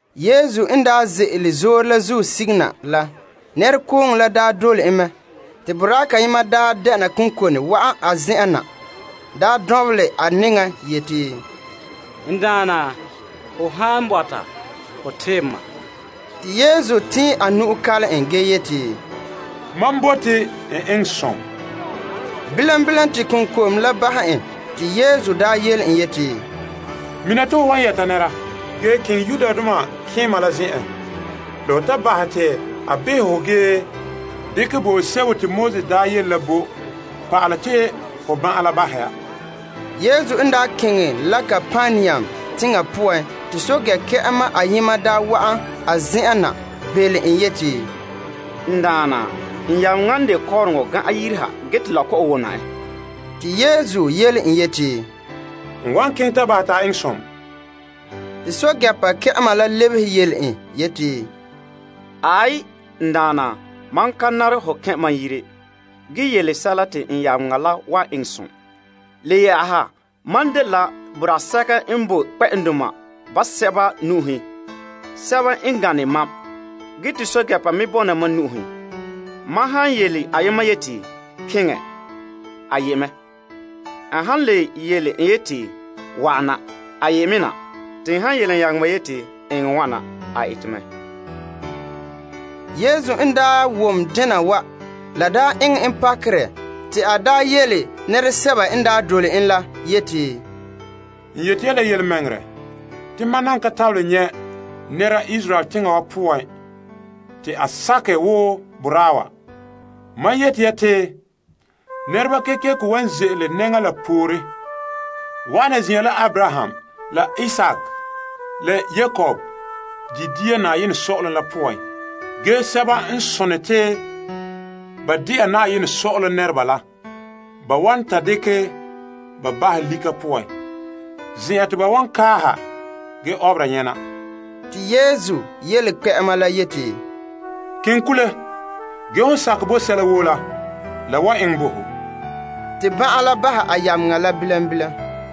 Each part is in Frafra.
Yesu n daa ze'ele zoore la zuo sige na la, nɛrekooŋɔ dole en mɛ. Te boraa kayema dɛna konkone wa'an a zen'en na, dɔnbelɛ a nɛŋa yeti, N Daana, ho han bɔta, ho tebɛ ma. Te Yesu tɛɛn a nu'o kalom en gee yeti, Mam bote, eŋɛ som! Bilam bilam te konkom la bahɛ en. Te Yesu yele en yeti, Mina te ho wan yɛta nɛra, ge keŋɛ malema la zen'en la ho ta bahɛ te a behɛ ho gee dekɛ bo'olom sebo te Moses daa yele la bo, pa'alɛ te ho ban'an la bahɛ ya. Yesu daa keŋɛ la Kapernaum teŋa poan te Arom teŋa pɛɛntɛɛnreba kpɛ'ɛma ayema wa'an a zen'en na belom en yeti, N Daana, n yameŋa n de kɔɔrɔŋɔ gan'an yire ha gee te la kɔ'ɔn wona en. Te Yesu yele en yeti, N wan keŋɛ ta bahɛ te a eŋɛ som. Te pɛɛntɛɛnreba kpɛ'ɛma la lebehe yele en yeti, Aai, N Daana, mam ka nare ho kɛn' mam yire. Ge yen bo nɔɔrɛ te n yameŋa la wan eŋɛ som. Le yɛ'ɛha, mam dela boraa sɛka n boe kpɛ'ɛndoma basɛba nu'uhen, sɛba n gane mam, ge te pɛɛntɛɛnreba me bɔna mam nu'uhen. Mam han yele ayema yeti, Keŋɛ, te a ye' mɛ. N han le yele ena yeti, Wa'ana, te a ye me na. Te n han yele n yameŋa yeti, Eŋɛ wana, te a ete mɛ. Yesu n daa wom dena wa, la daa eŋɛ en pakerɛ te a daa yele nɛresɛba n daa dole en la yeti, N yeti ya la yelemɛŋɛrɛ te mam nan ka tabelɛ nyɛ' nɛra Israel teŋa wa poan te a sakɛ woo boraa wa. Mam yeti ya te nɛreba kekeko wan ze'ele nɛŋa la poore wa'ana zin'an la Abraham la Isaak, la Yakob di' dia saazuo sɔ'ɔlom la poan, ge sɛba n sone te ba de'a sɔ'ɔlom nɛreba la, ba wan ta lobe ba bahɛ lika poan, zen'an te ba wan kaaha ge ɔbera nyɛna. Te Yesu yele kpɛ'ɛma la yeti, Keŋɛ kule, ge hon sakɛ bo sɛla woo la, la la wan eŋɛ bo ho. Te ban'an la bahɛ a yameŋa la bilam bilam.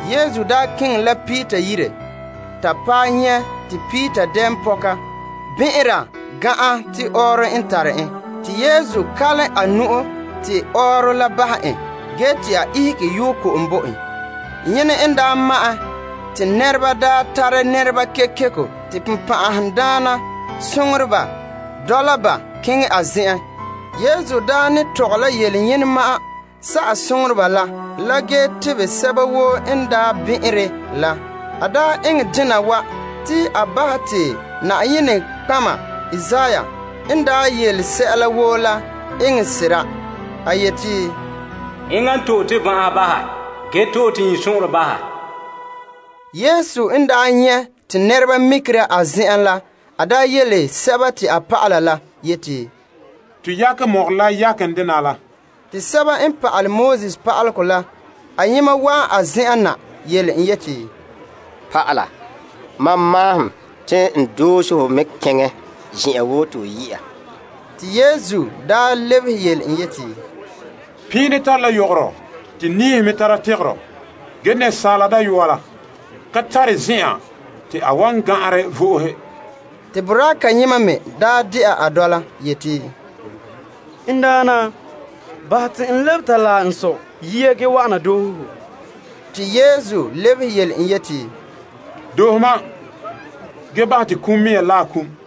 Yesu daa keŋɛ la Peter yire, ta paɛ nyɛ' te Peter dɛɛnpɔka bɛn'ɛnra gan'an te ɔɔrɔ n tare en. Te Yesu kalom a nu'o te ɔɔrɔ la bahɛ en, te a ihege yoo ko'om bo ba. Yene n daa ma'ɛn te nɛreba daa tare nɛreba kekeko te bonbɛ'ɛhe dɔla ba keŋɛ a zen'en. Yesu ne tɔgɛ la yele yene ma'an sa'ɛ bonbɛ'ɛhe la, la, ge tebɛ sɛba woo n bɛn'ɛnre la. A eŋɛ dena wa te a bahɛ te Yenɛ nɔtɔgɔha Isaiah n daa yele sɛla woo la eŋɛ sera, A to'e tomam ban'ahe, ge zi' tomam iŋtoo. Yesu n daa nyɛ' te nɛreba mikera a zen'en la, te yele a dɔlɔba la te ba yakɛ mɔgɔrɛ la yakenɛ dena la ha. Te sɛba n pa'alɛ Pa'alegɔ la ayema wa'an a zen'en nya yele en yeti, Pa'ala, mam maahom te n doohe ho mɛ keŋɛ zen'an woo te ho yɛ'a. Te Yesu lebehe yele en yeti, Piini tare la yogoro te niihe me tara tegero, ge Asaala Dayɔa la ka tare zen'an te a wan gan'anrɛ vo'ohe. Te boraa kayema me dɛna a dɔla, yeti, N Daana, bahɛ te n lebe ta laɛ n sɔ yia ge wa'ana doohe ho. Te Yesu lebehe yele en yeti, Doohe mam ge bahɛ te kum mea laɛ kum.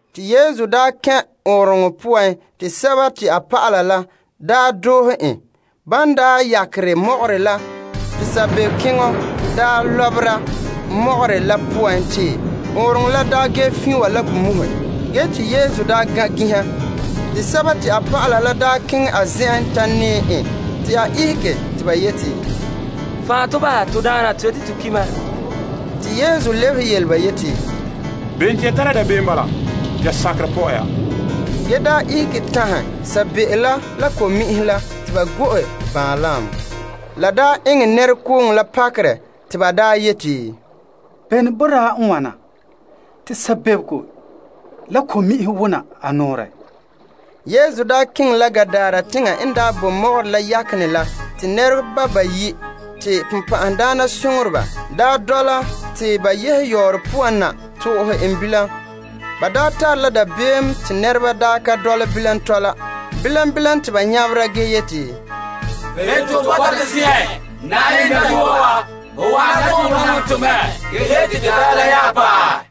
Te Yesu n daa kɛn' ɔɔnrɔŋɔ poan te a dɔlɔba la doohe en. Ban yakere mɔgɔrɛ la te saabeeokeŋɔ lɔbera mɔgɔrɛ la poan te ɔɔnrɔŋɔ la ge fiin wa la ko muhe. Ge Yesu gan' ginha. Te dɔlɔba la keŋɛ a zen'en ta nɛɛ en te a ihege ge yeti, Fan' to bahɛ, to Daana. To yeti to ki' mɛ! Te Yesu lebehe yele ba yeti, Bem te ya tara dabeem bala? Ya sakerɛ pɔ'ɛ ya! Ge te a daa ihege tanhɛ sabeeo la la ko'mi'inhe la te ba go'e baanlam. La daa eŋɛ nɛra woo pakerɛ, te ba yeti, Bene boraa n wana? Sabeeo la ko'mi'inhe nya wona a nɔɔrɛ! Yesu n daa keŋɛ la Gadara teŋa n bo mɔgɔrɛ la yaken dena la, nɛreba bayi' te bonbɛ'ɛhe dɔla te ba yehe yɔɔrɔ poan na to'ohe en bilam. Bama n de sɛba n gbiti te nɛreba ka dɔla bilam tɔla. Bilam bilam te ba nyabera ge yeti, Bem te ho bɔta to zen'en, Yenɛ dayɔa wa? Ho wa'ana te ho namehɛ to mɛ gee te de daarɛ la nya paɛ?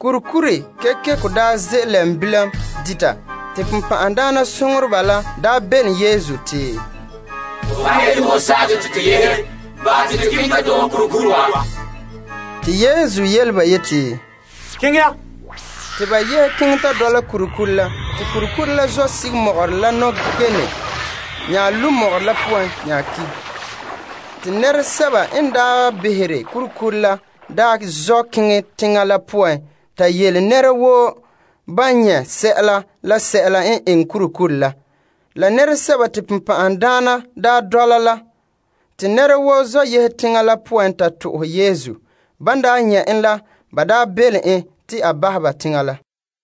Kurikuri kekeko ze' lɛm bilam dita. Te bonbɛ'ɛhe la bɛlena Yesu te, Ho han yeti ho sa'ɛ tɔ te to yehe, bahɛ te to keŋɛ ta doohe kurikuri wa. Te Yesu yele ba yeti, Keŋɛ ya! Te ba yehe keŋɛ ta kɛn' kurikuri la poan. Te kurikuri la zɔ' ta lu' mɔgɔrɛ la poan ki'. Te nɛresɛba n behere kurikuri la daa zɔ' keŋɛ teŋa la poan ta yele nɛra woo ban nyɛ' la sɛla n eŋɛ kurikuri la, la se'em te bonbɛ'ɛhe daa dɔla la. Te nɛra woo zɔ' yehe teŋa la poan ta to'ohɛ Yesu. Ban nyɛ' en la, ba daa belom en te a bahɛ ba teŋa la.